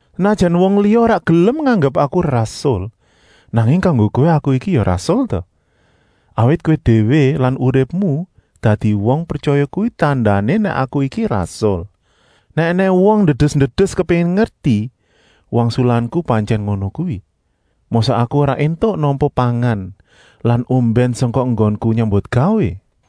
Senajan wong liya ora gelem nganggep aku rasul, nanging kanggo kowé aku iki ya rasul ta? Awit kowé déwé lan uripmu dadi wong pretyaya kuwi tandané nèk aku iki rasul. Nèk ènèng wong ndedes-ndedes kepéngin ngerti, wangsulanku pantyèn ngono kuwi. Mosok aku ora éntuk nampa pangan lan ombèn sangka enggonku nyambutgawé?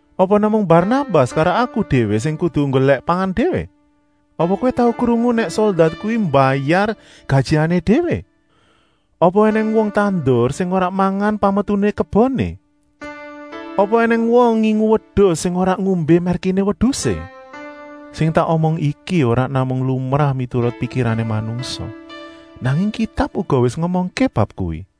Apa namung Barnabas karo aku déwé sing kudu nggolèk pangan déwé? Apa kowé tau krungu nèk soldat kuwi mbayar gajihané déwé? Apa ènèng wong tandur sing ora mangan pametuné keboné? Apa ènèng wong ngingu wedus sing ora ngombé mèrkiné wedusé? Sing tak omong iki ora namung lumrah miturut pikirané manungsa, nanging Kitab uga wis ngomongké bab kuwi.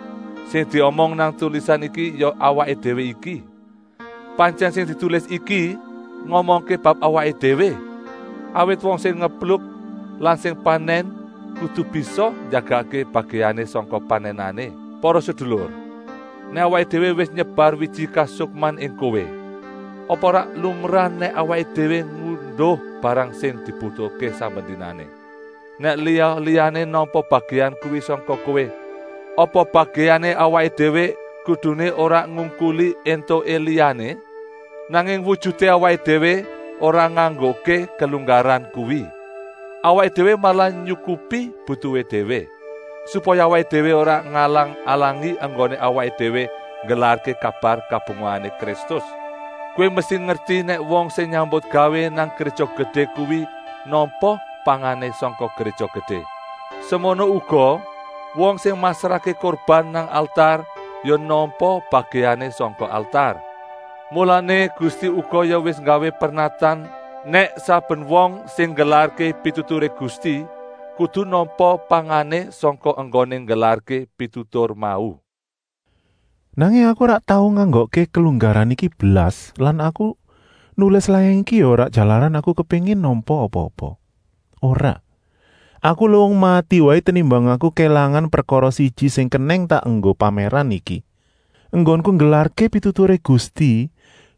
Sing diomong nang tulisan iki ya awaké déwé iki! Pantyèn sing ditulis iki ngomongké bab awaké déwé, awit wong sing ngepluk lan sing panèn kudu bisa njagakké bagèané sangka panènané. Para sedulur, nèk awaké déwé wis nyebar wiji kasukman ing kowé, apa ora lumrah nèk awaké déwé ngunduh barang sing dibutuhké saben dinané. Nèk liya-liyané nampa bagèan kuwi sangka kowé, apa bagèané awaké déwé kuduné ora ngungkuli éntuké liyané? Nanging wujuté awaké déwé ora nganggokké kelunggaran kuwi; awaké déwé malah nyukupi butuhé déwé, supaya awaké déwé ora ngalang-alangi enggoné awaké déwé nggelarké kabar kabungahané Kristus. Kowé mesti ngerti nèk wong sing nyambutgawé nang Gréja Gedé kuwi nampa pangané sangka Gréja Gedé. Semono uga, wong sing masrahké kurban nang altar ya nampa bagèané sangka altar. Mulané Gusti uga ya wis nggawé pernatan nèk saben wong sing nggelarké pituturé Gusti kudu nampa pangané sangka enggoné nggelarké pitutur mau. Nanging aku ora tau nganggokké kelunggaran iki blas lan aku nulis layang iki ya ora jalaran aku kepéngin nampa apa-apa. Ora, aku luwung mati waé tenimbang aku kélangan prekara siji sing kenèng tak enggo pamèran iki. Enggonku nggelarké pituturé Gusti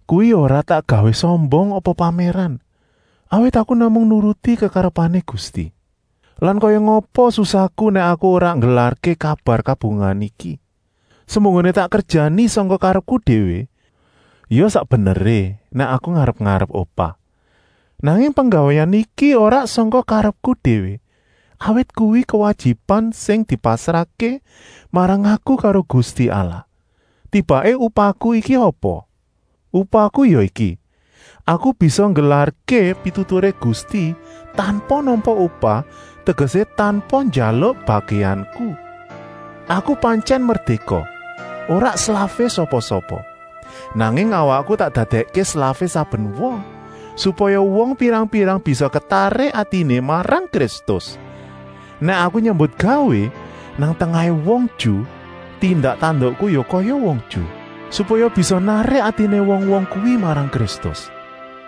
kuwi ya ora tak gawé sombong apa pamèran, awit aku namung nuruti kekarepané Gusti. Lan kaya ngapa susahku nèk aku ora nggelarké kabar kabungahan iki. Semunggoné tak kerjani sangka karepku déwé, ya sak beneré nèk aku ngarep-arep upah. Nanging penggawéan iki ora sangka karepku déwé, awit kuwi kuwajiban sing dipasrahké marang aku karo Gusti Allah. Tibaké upahku iki apa? Upahku ya iki: aku bisa nggelarké pituturé Gusti tanpa nampa upah, tegesé tanpa njaluk bagèanku. Aku pantyèn merdéka, ora slafé sapa-sapa. Nanging awakku tak dadèkké slafé saben wong, supaya wong pirang-pirang bisa ketarik atiné marang Kristus. Nèk aku nyambutgawé nang tengahé wong Ju, tindak-tandukku ya kaya wong Ju, supaya bisa narik atiné wong-wong kuwi marang Kristus.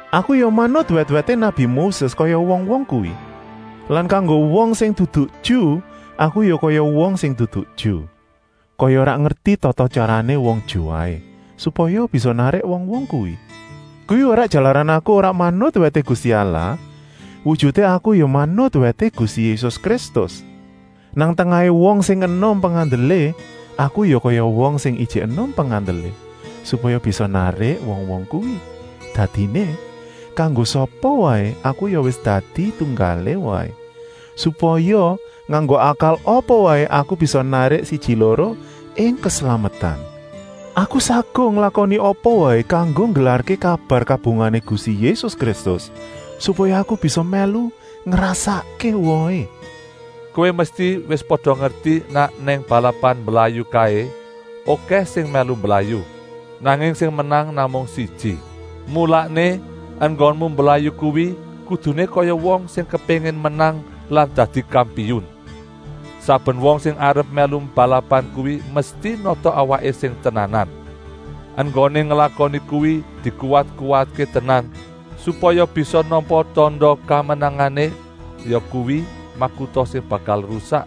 Aku ya manut wèt-wèté nabi Moses kaya wong-wong kuwi. Lan kanggo wong sing dudu Ju aku ya kaya wong sing dudu Ju, kaya ora ngerti tata-tyarané wong Ju waé, supaya bisa narik wong-wong kuwi. Kuwi ora jalaran aku ora manut wèté Gusti Allah, wujuté aku ya manut wèté Gusti Yésus Kristus. Nang tengahé wong sing enom pengandelé, aku ya kaya wong sing ijik enom pengandelé, supaya bisa narik wong-wong kuwi. Dadiné, kanggo sapa waé aku ya wis dadi tunggalé waé, supaya nganggo akal apa waé aku bisa narik siji-loro ing keslametan. Aku saguh nglakoni apa waé kanggo nggelarké kabar kabungahané Gusti Yésus Kristus, supaya aku bisa mèlu ngrasakké wohé. Kowé mesti wis pada ngerti nèk nang balapan mblayu kaé okèh sing mèlu mblayu, nanging sing menang namung siji. Mulané, enggonmu mblayu kuwi kuduné kaya wong sing kepéngin menang lan dadi kampiun. Saben wong sing arep mèlu balapan kuwi mesti nata awaké sing tenanan. Enggoné nglakoni kuwi dikuwat-kuwatké tenan, supaya bisa nampa tanda kamenangané, yakuwi, makuta sing bakal rusak.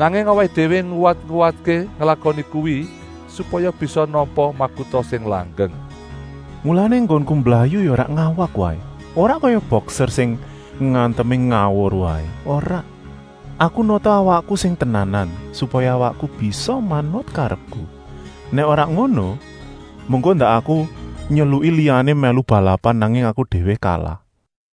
Nanging awaké déwé nguwat-nguwatké nglakoni kuwi, supaya bisa nampa makuta sing langgeng. Mulané enggonku mblayu ya ora ngawak waé, ora kaya bokser sing ngantemé ngawur waé, ora. Aku nata awakku sing tenanan, supaya awakku bisa manut karepku. Nèk ora ngono, mengko ndak aku nyeluki liyané mèlu balapan, nanging aku déwé kalah.